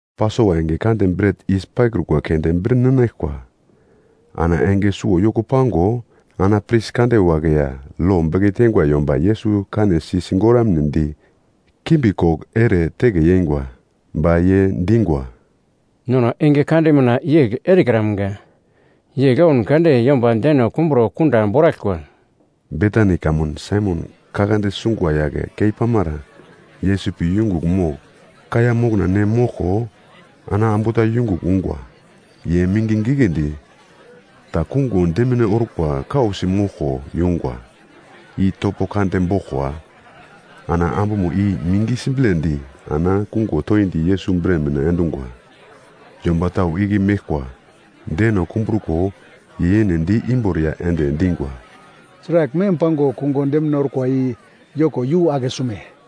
Pasova enge kande bret yis paikrukwa keunde bir ninaglkwa ana enge suwo yoko pango ana pris kande wagle ya lo beke teingwa yomba Yesus kanesi sigoramnedi kimbi koglo ere teke yeingwa. Ba ye dingwa, “Nono enge kade mina yegl erekramga, yegl oun kade yomba deno kumbro kunda boraglkwa.” Betani kamun Saimon kaglande sungwa yagle kei pamara Yesus pi yungugl mogl kaiya mokna ne moglko ana ambu ta yungugl ungwa. Ye mingi giglendi ta kungo demine orkwa kausi moglko yungwa, i topo kande boglkwa, ana ambumo i mingi siblendi ana kungo toindi Yesus bre mina endungwa. Yomba tau igle meglkwa deno kumbruko ye yene di imboriya ende dingwa, “Sragl mem pango kungo demine orkwa i yoko yu akesume?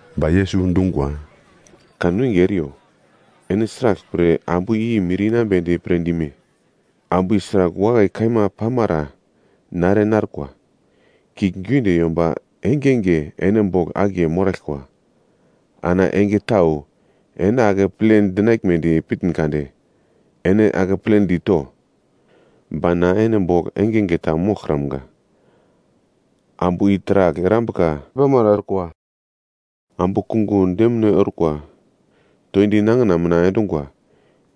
Ba Yesus dungwa, “Kanwinge eriyo, ene sraglpre ambu i mir inambedi pre dime? Ambu i sragl wakai kaima pamara na ere narkwa. Kiuglgiunde yomba engenge ene bogl akiye moraglkwa. Ana enge tau ene akeple dinagledi pitn kade ene akepledi to. Ba na ene bogl engenge ta moglkramga. Ambu i taragl erambuka pamara orkwa. Ambu kungo demine orkwa toindi nangina mina endungwa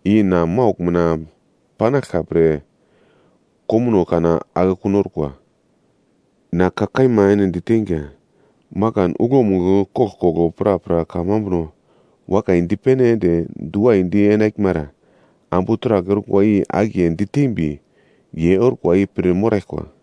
i na maugl mina panaglka pre komuno kana akekun orkwa. Na ka kaima ene diteinga, makan uglomugl koglkoglo prapra kamambuno wakai dipene ende diwaidi enaglmara, ambu taragl orkwa i akiye ditembi, ye orkwa i pir moraglkwa.”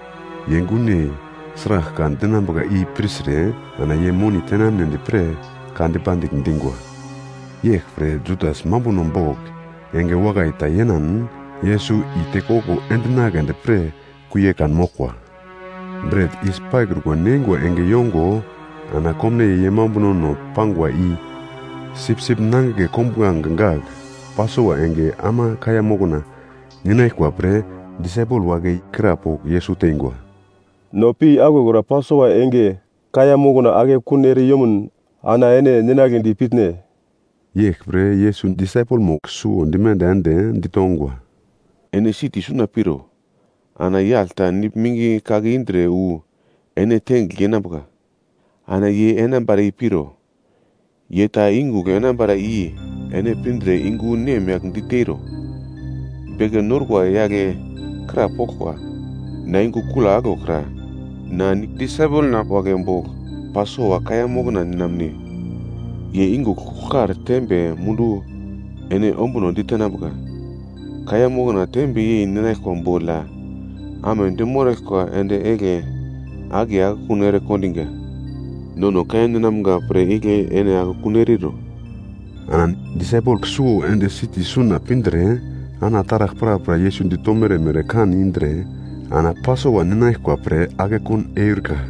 Ye gunyei sragl ka dinambuka i pirtre ana ye moni tenamnedi pre ka dipandigl dingwa. Yeglpre Judas mambuno bogl enge wakai ta yenan, Yesus i tekoglo endinagledi pre kuie kanmoglkwa. Bret yis paikruko neingwa enge yongo ana komnaiye ye mambunono pangwa i, sipsip nangigle kombuglange gagl Pasova enge ama kaiya mokna ninaglkwa pre disaipel wagle krapogl Yesus teingwa, “No pi aglokra Pasova enge kaiya mokna akekun ere yomun ana ene ninagledi pitne?” Yeglpre Yesus disaipelmo suwo dimenda ende ditongwa, “Ene siti suna piro. Ana yagl ta nigl mingi kake indre wu ene tengigl yenambuka, ana ye enambara i piro. Ye ta yungugl enambara i ene pindre yungu nemyagl diteiro, ‘Beke norkwa yagle krapoglkwa: Na yungu kula aglo kra? Na disaipelna wagle bogl Pasova kaiya mokna ninamne.’ Ye yungugl kugl kar tembe mundu ene ombuno ditenambuka, kaiya mokna tembe yei ninaglkwa bogl ya, amedi moraglkwa endi egle akiye akekun ere kondingwa. Nono kaiya ninamga pre igle ene akekun eriro.” Ana disaipel suwo ende siti suna pindre ana taragl prapra Yesus ditomere mere kan indre ana Pasova ninaglkwa pre akekun eurika.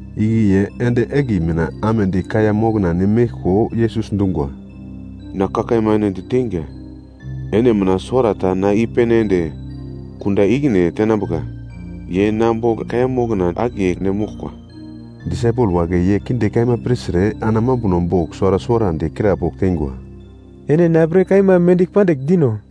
Igle ye endi egle mina amedi kaiya mokna ne meglko Yesus dungwa, “Na ka kaima ene diteinga, ene mina suwarata na i-pene ende kunda ikine tenambuka, ye na bogl kaiya mokna akiye ne moglkwa.” Disaipel wagle ye kinde kaima pirtre ana mambuno bogl suwara suwarandi krapogl teingwa, “Ene na pre kaima mendigl pandigl dino?”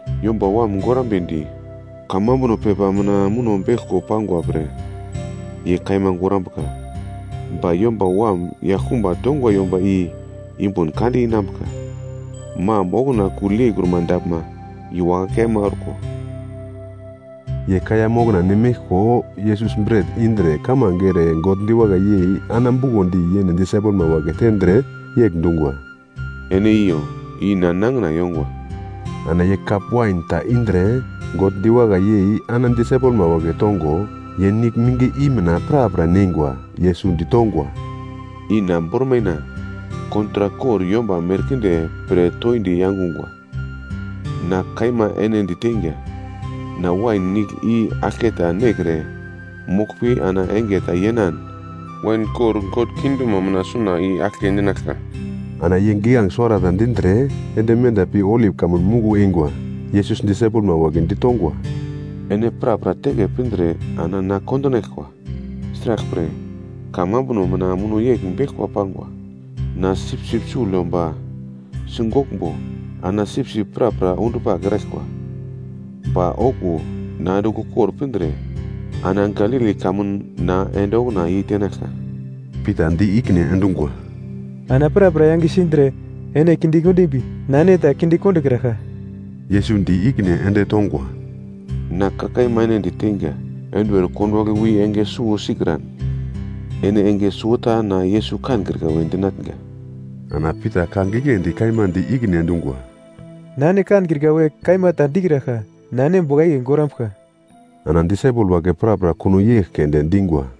Yomba Wam gorambedi kamambuno pepa mina muno beglko pangwa pre ye kaima gorambuka. Ba Yomba Wam yaglkumba tongwa yomba i yumbun kande inambuka, mam okuna kugl yeikruma daglma i wakai kaima orko.” Ye kaiya mokna ne meglko, Yesus bret indre kamange ere God diwakai yei ana bukondi yene disaipelma wagle tendre, yegl dungwa, “Ene iyo, i na nangina yongwa.” Ana ye kap wain ta indre, God diwakai yei ana disaipelma wagle tongo, ye nigl mingi i mina prapra neingwa. Yesus ditongwa, “I na bormaina kontrak kor yomba merkinde pre toindi yangungwa. Na kaima ene diteinga, na wain nigl i aglketa nekre moglpi ana enge ta yenan wain kor God kingdomo mina suna i aglke ninaglka.” Ana ye giglange suwarata dindre, ende menda pi Olip Kamun Muglo eingwa. Yesus disaipelma wagle ditongwa, “Ene prapra teke pindre ana na kondinaglkwa. Sraglpre, kamambuno mina muno yegl beglkwa pangwa: “‘Na sipsip sugl yomba sigoglmbo, ana sipsip prapra undupagl eraglkwa.’ Ba okuwo na andigl ukor pindre ana Galili kamun na ende okuna yei tenaglka.” Pita di ikine endungwa, “Ana prapra yange sindre ene kinde kondimbi na ene ta kinde kondokraglka.” Yesus di ikine ende tongwa, “Na ka kaima ene diteinga, enduwer konduwagle wi enge suwo sikran, ene enge suwota na Yesus kankrika we dinatnga.” Ana Pita ka giglendi kaima di ikine endungwa, “Na ene kankrika we kaima ta dikraglka, na ene bogl akiye gorambuglka.” Ana disaipel wagle prapra kuno yegl keunde dingwa.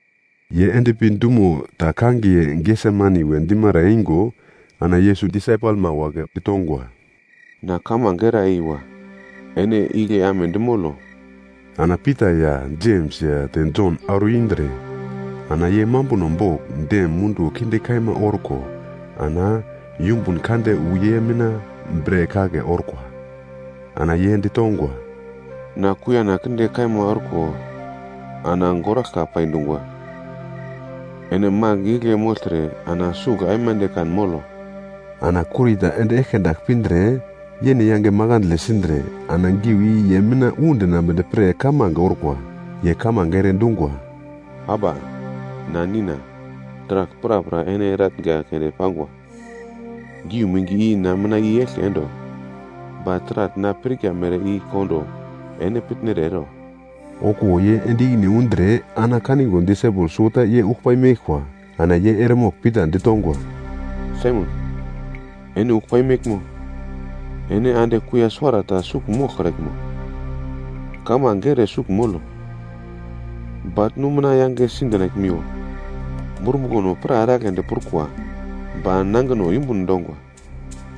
Ye endpi dumo ta kangiye Gesemani we dimara eingo ana Yesus disaipelma wagle ditongwa, “Na kamange era eiwa. Ene igle amedi molo.” Ana Pita ya Jems ya te Jon auro indre ana ye mambuno bogl dem munduwo kinde kaima orko ana yumbun kande wu ye mina bre kake orkwa. Ana ye ditongwa, “Na kuiyana kinde kaima orko ana goraglka pai dungwa. Ene magl igle mogltre ana sugl aimande kan molo.” Ana kurita ende eglke dagl pindre, yene yange makandle sindre ana giu i ye mina undinambedi pre kamange orkwa. Ye kamange ere dungwa, “Aba, na Nina. Taragl prapra ene eratnga keunde pangwa. Geu mingi i na mina i-yeglke endo. Ba taragl na pirka mere i kondo ene pitnere ero.” Okuwo ye ende ikine undre ana kango disaipel suwota ye uglpai meglkwa. Ana ye eremogl Pita ditongwa, “Saimon, ene uglpai meglmo? Ene ande kuiya suwarata sugl moglkraglmo? Kamange ere sugl molo, baglnu mina yangesi dinaglmiwo. Spiritno pra eragledi prukwa, ba nangino yumbun dongwa.”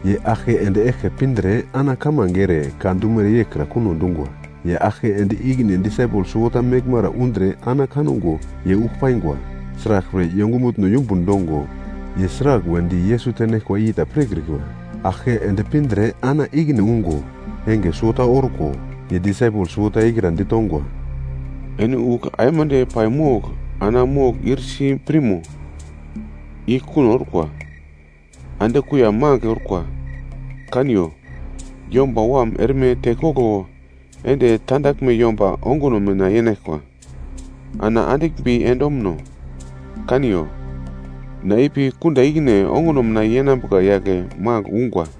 Ye aglke ende eglke pindre ana kamange ere, ka dumere yeglkra kuno dungwa. Ye aglke ende ikine disaipel suwota meglmara undre ana kango ye ugl paingwa. Sraglpre, ye ongumutno yumbun dongo, ye sragl wedi Yesus tenaglkwa i ta pirkrikwa. Aglke ende pindre ana ikine ungo enge suwota orko, ye disaipel suwota ikra ditongwa, “Ene ugl aimande paimogl ana mogl ir si pirmo? I kuno orkwa! Ande kuiya magl orkwa. Kaniyo, Yomba Wam erme tekoglo ende tandaglme yomba onguno mina yenaglkwa. Ana andiglmbi ende omuno. Kaniyo, na ipi kunda ikine onguno mina yenambuka yagle magl ungwa!”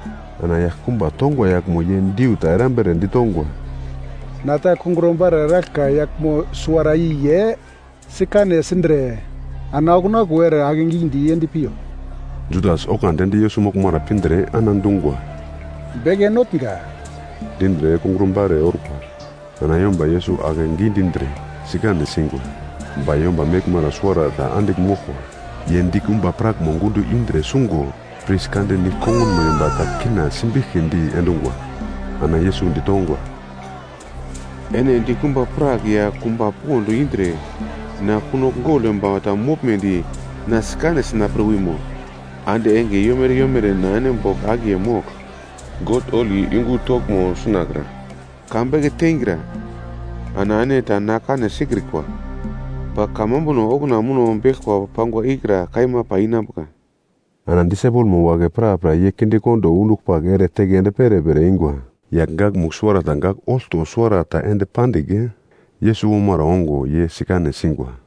Ana yaglkumba tongwa yaglmo ye diu ta erambere ditongwa, “Na ta kungro-bare eraglka yaglmo suwara i ye sikane sindre ana okuna okuwo ere akegidi yend piyo.” Judas oglandi ende Yesus moglmara pindre ana dungwa, “Beke Notnga!” dindre kungro-bare orkwa. Ana yomba Yesus ake gidindre sikane singwa. Ba yomba meglmara suwarata andigl moglkwa, ye dikumba prakmo gundo indre sungo pris kande nigl kongunmo yomba ta kina simbiglkidi endungwa. Ana Yesus ditongwa, “Ene dikumba prak ya kumba pond indre na kunogl gogl yomba ta moglmedi na sikane sina pre wimo? Ande enge yomere yomere na ene bogl akiye mogl God holi yungu toglmo sunakra ka beke teingra, ana ene ta na kane sikrikwa. Ba Kamambuno okuna muno beglkwa pangwa ikra kaima pai inambuka.” Ana disaipelmo wagle prapra ye kindekondo undupagl ere teke ende perepere eingwa. Yagl gakmugl suwarata gagl olto suwara ta ende pandigl, Yesus omara ongo ye sikane singwa.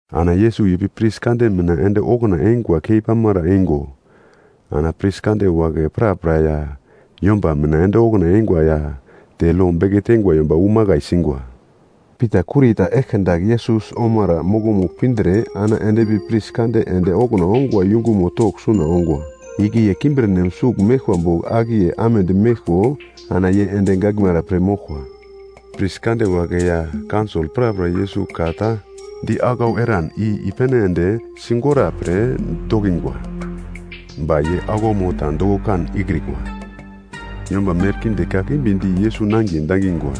Ana Yesus ipi pris kande mina ende okuna ongwa kei pamara eingo ana pris kande wagle prapra ya yomba mina ende okuna eingwa ya te lo beke teingwa yomba wu makai singwa. Pita kurita eglke dagl Yesus omara mokomugl pindre ana endpi pris kande ende okuna ongwa yungumo togl suna ongwa. Igle ye kimbirnem sugl meglkwa bogl akiye amedi meglko ana ye ende gaglmara pir moglkwa. Pris kande wagle ya kaunsol prapra Yesus ka ta di aglau eran i-pene ende sigora pre dokingwa, ba ye aglaumo ta doko kan ikrikwa. Yomba merkinde kakimbi di Yesus nangiye dangingwa.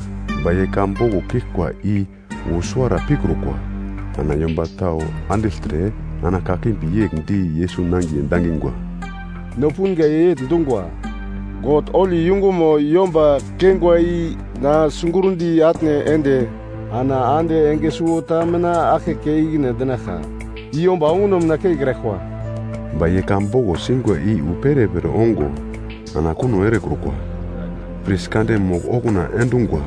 Ba ye ka boglo kiglkwa i wu suwara pikrukwa. Ana yomba tau andigltre ana kakimbi yegl di Yesus nangiye dangingwa, “No punga ye yegl dungwa, ‘God holi yungumo yomba keingwa i na sigurndi atne ende, ana ande enge suwota mina aglke kei ikine endinaglka. I yomba onguno mina keikraglkwa.’” Ba ye ka boglo singwa i wu perepere ongo ana kuno erekrukwa. Pris kande mogl okuna endungwa,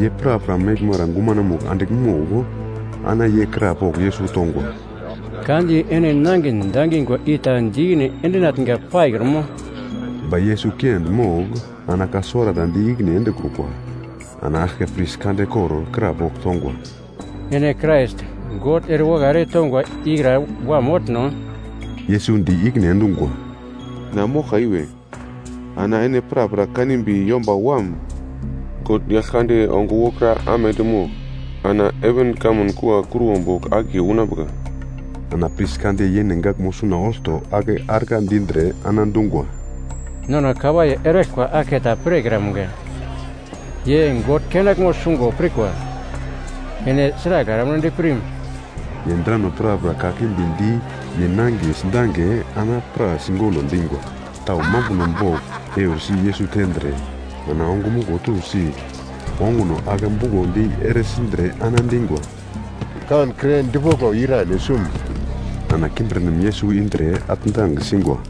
ye prapra meglmara gumanomugl andigl mogl ana ye krapogl Yesus tongwa, “Ka di ene nangin dangingwa i ta di ikine endinatnga paikrumo?” Ba Yesus kiendi mogl ana ka suwarata di ikine endekrukwa. Ana aglke pris kande kor krapogl tongwa, “Ene Krais God ere wakai ere tongwa ikra Wam motno?” Yesus di ikine endungwa, “Na moglka iwe. Ana ene prapra kanimbi Yomba Wam, God Yaglkande ongo wokra amedi mogl ana heven kamun kua kruwo bogl akiye unambuka.” Ana pris kande yene gaglmo suna olto ake argla dindre ana dungwa, “Nono kawaiye eraglkwa aglketa pirkramga. Ye God kenaglmo sungo pirkwa, ene sragl eramnedi pirme?” Ye drano prapra kakimbi di ye nangiye sidange ana ye pra sigolo dingwa. Tau mambuno bogl eursi Yesus tendre ana ongumuglo tusi, onguno ake bukondi ere sindre ana dingwa, “Kankre dipoglo, ira ene sum?” Ana kimbirnem Yesus indre atndang singwa.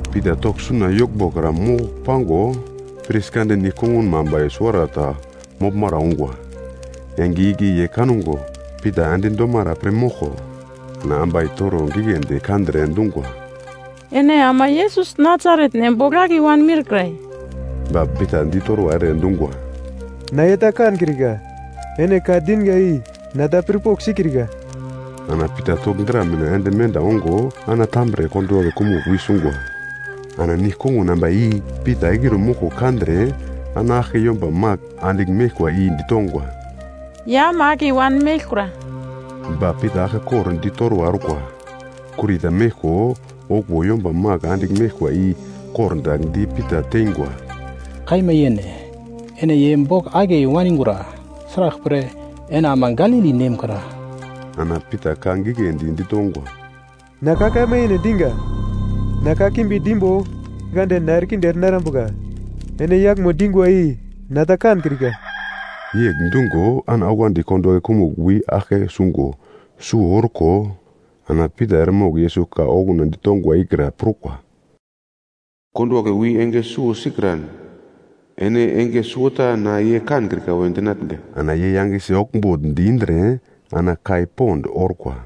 Pita togl suna yoglmbo kra mogl pango, pris kande nigl kongunmo ambai suwarata moglmara ungwa. Enge igle ye kango Pita endi domara pir moglko ana ambai toro giglendi kandre dungwa, “Ene ama Yesus, Nasaret nem bogl akiye wanmiurkra.” Ba Pita ditorwa ere dungwa, “Na ye ta kankrika, ene ka dinga i na ta pirpogl sikrika.” Ana Pita togl dra mina ende menda ongo, ana tambre konduwagle kumugl wi sungwa. Ana nigl-kongun ambai i Pita eglire moglko kandre ana aglke yomba magl andigl meglkwa i ditongwa, “Ye ama akiye wanmeglkura.” Ba Pita aglkekor ditorwa orkwa. Kurita meglko okuwo yomba magl andigl meglkwa i kordagl di Pita teingwa, “Kaima yene, ene ye bogl akiye waningura. Sraglpre, ene ama Galili nem kra.” Ana Pita ka giglendi ditongwa, “Na ka kaima yene diga! Na kakimbi dimbo God na erekinde ere narambuka. Ene yaglmo dingwa i na ta kankrika.” Yegl dungo ana oglandi konduwagle kumugl wi aglke sungo suwo orko, ana Pita eremogl Yesus ka okuna ditongwa ikra prukwa, “Konduwagle wi enge suwo sikran ene enge suwota na ye kankrika we dinatnga.” Ana ye yangesi oglmbugldi indre ana kai pond orkwa.